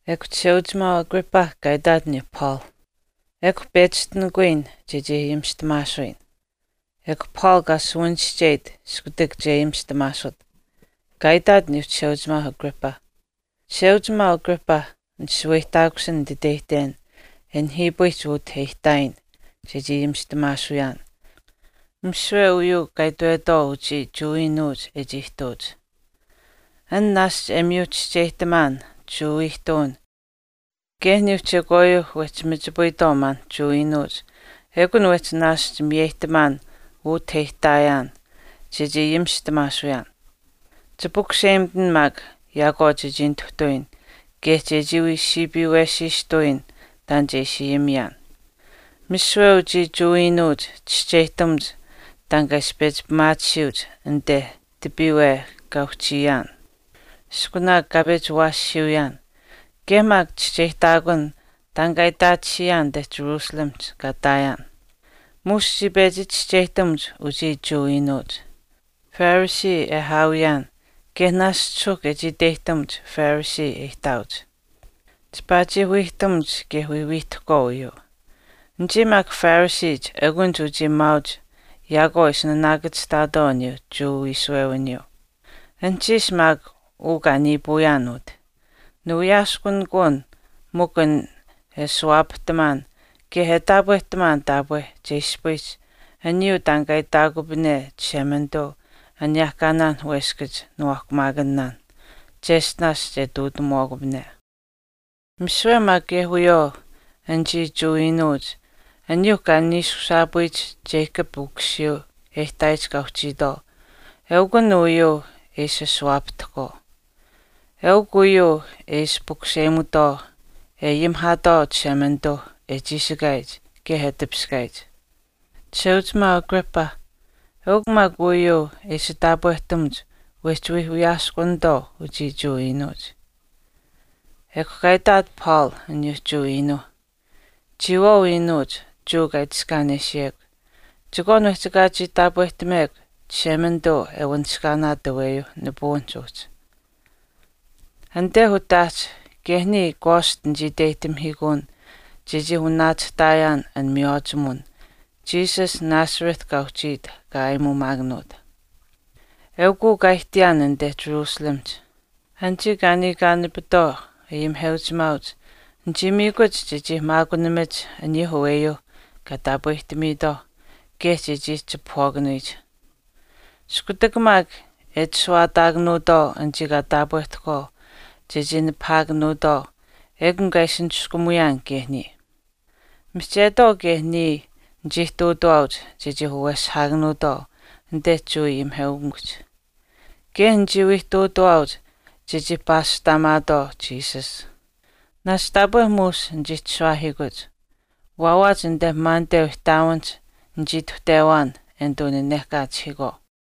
Ekw chisheuchimaau Agrippa kaa itaat aniyuu Paul, “Ekw pechishtinikuyin chechii ayimishtamaasuyin.” Ekw Paul kaa suwanischeyit iskutak che ayimishtamaasut. Kaa itaat aniyuu chisheuchimaau Agrippa, “Chisheuchimaau Agrippa, nishaweyihtaakusin nititeyihten e nihiipayihch utah e ihtaayin chechii ayimishtamaasuyaan misiwe uyuu kaa itwetwaau uchii Jewa iinuuch e chii ihtuuch. An naashch e miyu chischeyihtaman Jewa ihtuwinh kaye aniyuu chekwaayuuh wehchi machipayitwaau maan Jewa iinuuch ekun wehchi naashch miyeyihtamaan utah e ihtaayin chechii ayimishtamaasuyaan. Chipukuseyimitin maak yaakwaau chechii nituhtawiyin kaye che wii siipiiwesiistawiyin taan che ishi ayimiyaan.” “Misiwe uchii Jewa iinuuch chischeyihtamuch taan kaa ishi pechi pimaatisiyuuch anite tipiiwe kaa uhchiyaan iskunaak kaa pechi awaashiiuyaan kaye maak chischeyihtaakun taan kaa itaatisiyaan anite jerusalemihch kaa ihtaayaan. Muush chii pechi chischeyihtamuch uchii Jewa iinuuch, Pharisee e aawiyaan kaye naashch suuhk e chii iteyihtamuch Pharisee e ihtaauch. Chipaa chii wiihtamuch kaye wii wiihtahkwaau uyuu. Anichii maak Phariseech eukunich anichii maauch yaakwaau e ishi naanaakachihtaatwaau uyuu Jewa wiishuwewiniyuu. Anuhchiish maak uu kaa niipuuyaan utah, niwiyaaskunikuun mikw an e ashuwaapahtamaan kaye e taapwehtamaan taapwe che ispayiyich aniyuu taan kaa itaakupane Chishemanituu aniyehkaanaan weskach niwaahkuumaakanaan cheshtinaash che ihtuutamuwaakupane. Misiwe maak kaye wiyawaau anichii Jewa iinuuch aniyuuh kaa niishushaapuyich Jacob ukusiyuu e ihtaayich kaa uhchiitwaau eukw uyuu e ashuwaapahtahkwaau. Eukw uyuu e ishi pukuseyimutwaau e ayimihaatwaau Chishemanituu e chiishikaayich kaye e tipiskaayich. Chisheuchimaau Agrippa, eukw maak uyuu e ishi taapwehtamuch wehchi wii wiyaaskunitwaau uchii Jewa iinuuch. Ekw kaa itaat Paul aniyuu Jewa iinuuh, chiyawaau iinuuch Jewa kaa itiskaanesiyekw, chekwaan wehchi ekaa chii taapwehtamekw Chishemanituu e wanishkaanaat aweyuu nipuwinihch uhchi.” “Anite utaahch kaye niya kwaast nichii iteyihtamihiikuun chechii wanaachihtaayaan an miywaachimuwin Jesus Nazareth kaa uhchiit kaa aayimuumaakanuut. Eukuu kaa ihtiyaan anite Jerusalemihch. Anichii kaa niikaanapitwaau ayimiheuchimaauch nichii miikuch chechii maakunamach aniyuu aweyuuh kaa taapwehtamiitwaauh kaye chechii chipahwaakanuyich. Iskutak maak e itashuwaataakanuutwaau anichii kaa taapwehtahkwaau chechii nipahaakanuutwaau ekun kaa ishi niskumuyaan kaye niya. Mihchetwaau kaye niya nichii ihtuutawaauch chechii waweshihaakanuutwaau anite Jewa ayimiheukamikuhch, kaye nichii wii ihtuutuwaauch chechii paashtaamaatwaau Jesus. Naashch taapwe muush nichii chishuwaahiikuuch, waawaach anite maaniteu ihtaawinihch nichii ituhtewaan e nituu nanehkaachihiikwaau.”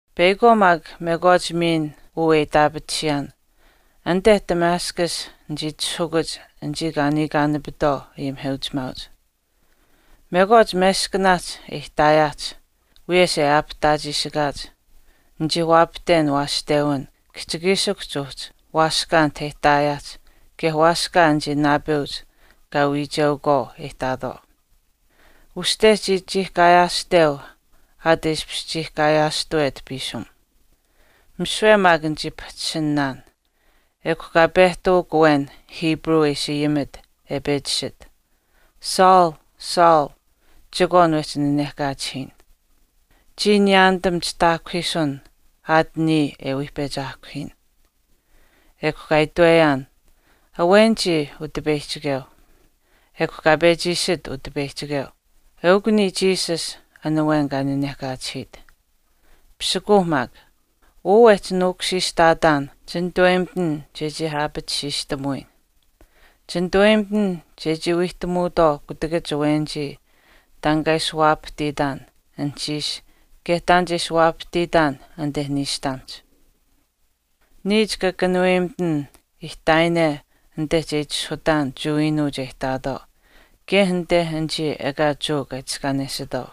“Peyakwaau maak mekwaach miin uu e itaapatisiyaan, anite Damascus nichii itishahukuch anichii kaa niikaanapitwaau ayimiheuchimaauch. Mekwaach meskanaahch e ihtaayaahch, wiyesh e aapihtaachiishikaach, nichii waapahten waashtewin kihchikiishikuhch uhchi waaskaa anit e ihtaayaan kaye waaskaa anichii naapeuch kaa wiicheukwaau e ihtaatwaau. Uste chii chiihkaayaashteu aat e ishpish chiihkaayaashtuwet piisim. Misiwe maak nichii pahchishinaan, ekw kaa pehtawak awen Hebrew e ishi ayimit e pechi iishit, ‘Saul, Saul chekwaan wehchi nanehkaachihiyin. Chiya niyaanitam chitaahkuhiisun aat niya e wii pechi aahkuhiyin.’ Ekw kaa itweyaan, ‘Awen chiya, Utipeyihchikeu.’ Ekw kaa pechi iishit Utipeyihchikeu, ‘Eukw niya Jesus an awen kaa nanehkaachihiit. Pisikuuh maak. Uu wechi nuukushiishtaatan chinituweyimitin chechii aapatisiishtamuyin. Chinituweyimitin chechii wiihtamuutwaau kutakach awenichii taan kaa ishi waapahtiitaan anuhchiish kaye taan che ishi waapahtiitaan anite niishtamihch. Niya chika kanuweyimitin ihtaayine anite che itishahutaan Jewa iinuuch e ihtaatwaau kaye anite anichii ekaa Jewa kaa itiskaanesitwaau.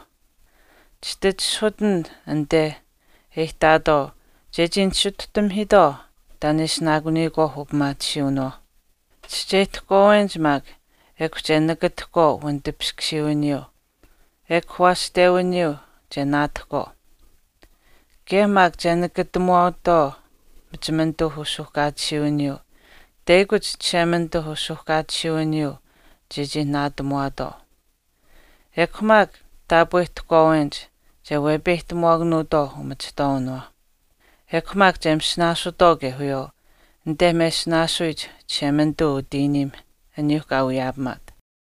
Chititishahutin anite e ihtaatwaau chechii nisituhtamihiitwaau taan e ishinaakuniyikwaauh upimaatisiiwinawaauh. Chischeyihtahkwaawenich maak ekw che nakatahkwaau wanitipiskusiiwiniyuu ekw waashtewiniyuu che naatahkwaau. Kaye maak che nakatamuwaatwaau machimanituu usuuhkaatisiiwiniyuu teyakuch Chishemanituuh usuuhkaatisiiwiniyuu chechii naatamuwaatwaau. Ekw maak taapweyimitwaawenich che wepeyihtamuwaakanuutwaau umachihtwaawinawaauh. Ekw maak che masinaasutwaau kaye wiyawaau anite mesinaasuyich Chishemanituu utiimiih aniyuuh kaa wiyaapamaat.’”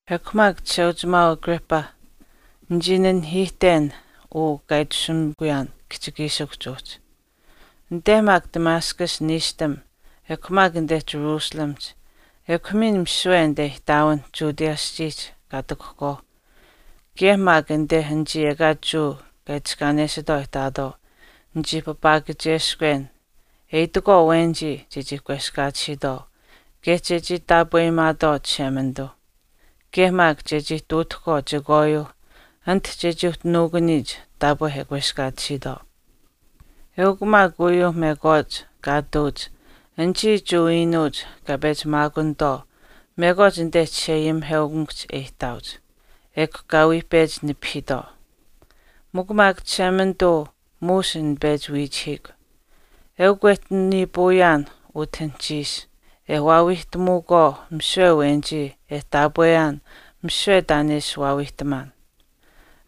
“Ekw maak Chisheuchimaau Agrippa, nichii nanihiihten uu kaa itashumikuyaan kihchikiishikuhch uhchi. Anite maak Damascus niishtam, ekw maak anite Jerusalemihch, ekw miin misiwe anite ihtaawinh Judea aschiihch kaa ihtakuhkwaauh kaye maak anite anichii ekaa Jewa kaa itiskaanesitwaau e ihtaatwaau nichii papaakacheskwen e itakwaau awenichii chechii kweskaatisiitwaau kaye chechii taapweyimaatwaau Chishemanituu, kaye maak chechii ihtuutahkwaau chekwaayuu anit chechii uhchi nuukuniyich taapwe e kweskaatisiitwaau. Eukw maak uyuu mekwaach kaa ihtuuch anichii Jewa iinuuch kaa pechi maakunitwaau mekwaach anite chisheayimiheukamikuhch e ihtaauch, ekw kaa wii pechi nipahiitwaau. Mikw maak Chishemanituu muush nichii pechi wiichihiikw, eukw wechi niipuuyaan utah anuhchiish e waawiihtamuukwaau misiwe awenichii e taapweyaan misiwe taan e ishi waawiihtamaan.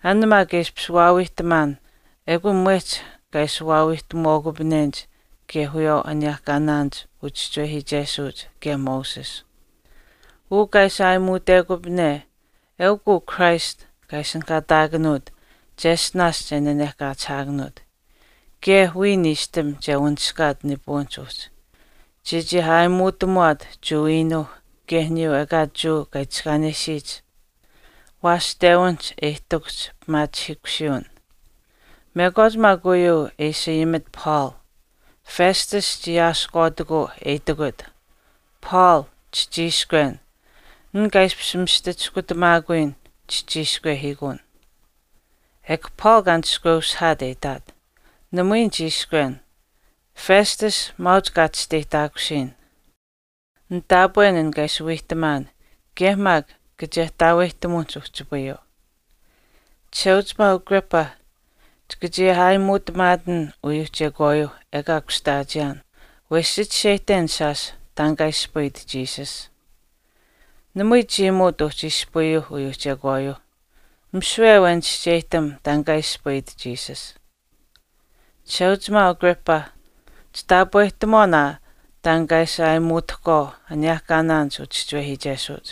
An maak e ishi waawiihtamaan ekun mwehch kaa ishi waawiihtamuwaakupanenich kaye wiyawaau aniyehkaanaanich uchischiwehiichesuuch kaye Moses. Uu kaa ishi aayimuutekupane eukw uu Christ kaa ishinihkaataakanuut cheshtinaash che nanehkaachihaakanuut, kaye wiya niishtam che wanishkaat nipuwinihch uhchi, chechii aayimuutamuwaat Jewa iinuuh kaye aniyuu ekaa Jewa kaa itiskaanesiyich waashtewinihch e ihtakuhch pimaachihiikusiiwin.” Mekwaach maak uyuu e ishi ayimit Paul, Festus chii aasihkwaatikuu e itikut, “Paul, chichiishkwen. An kaa ishpish mista chiskutamaakuyin chichiishkwehiikuun.” Ekw Paul kaa nishkweushihaat e itaat, “Namui nichiishkwen, Festus maauch kaa chisteyihtaakusiyin. Nitaapwen an kaa ishi wiihtamaan kaye maak kachehtaaweyihtamuwinihch uhchipayuu. Chisheuchimaau Agrippa, chika chii aayimuutamaatin uyuu chekwaayuu ekaa kushtaachiyaan wesh chichischeyihten shaash taan kaa ispayit Jesus. Namui chiimuut uhchi ispayuuh uyuuh chekwaayuuh, misiwe awen chischeyihtam taan kaa ispayit Jesus. Chisheuchimaau Agrippa, chitaapwehtamuwaan aa taan kaa ishi aayimuutahkwaau aniyehkaanaanich uchischiwehiichesuuch.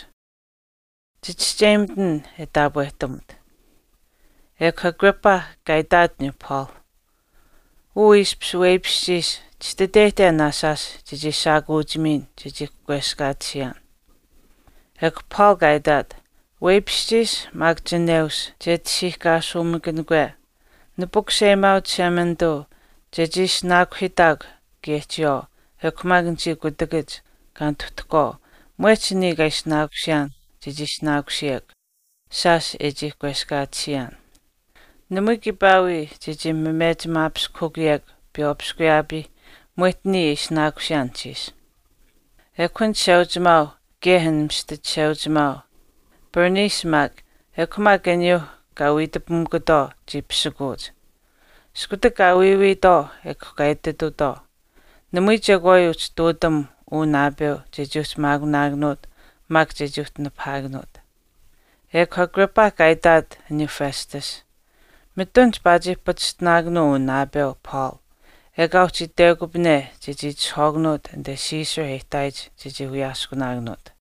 Chichischeyimitin e taapwehtamut.” Ekw Agrippa kaa itaat aniyuu Paul, “Uu ishpish weipishchiish chititeyihten aa shaash chechii shaakuuchimiin chechii kweskaatisiyaan.” Ekw Paul kaa itaat, “Weipishchiish maak chineush che tashiihkaasuumaakanikwe, nipukuseyimaau Chishemanituu chechii ishinaakuhiitaakw kaye chiyawaau ekw maak anichii kutakach kaa nituhtahkwaau mwehch niya kaa ishinaakusiyaan chechii ishinaakusiyekw, shaash e chii kweskaatisiyaan. Namui kiipaa wii chechii mechimaapiskahukuyekw piywaapiskuyaapii mwehch niya e ishinaakusiyaan anuhchiish.” Ekw an chisheuchimaau, kaye an mista chisheuchimaau, Bernice maak, ekw maak aniyuu kaa wiitapamikutwaau chii pisikuuch. Iskutak kaa wiiwiitwaau ekw kaa ititutwaau, “Namui chekwaayuu uhchi ihtuutam uu naapeu chechii uhchi maakunaakanuut maak chechii uhchi nipahaakanuut.” Ekw Agrippa kaa itaat aniyuu Festus, “Mitun chipaa chii pachishtinaakanuu uu naapeu Paul ekaa uhchi itwekupane chechii itishahwaakanuut anite Caesar e ihtaayich chechii wiyaaskunaakanuut.”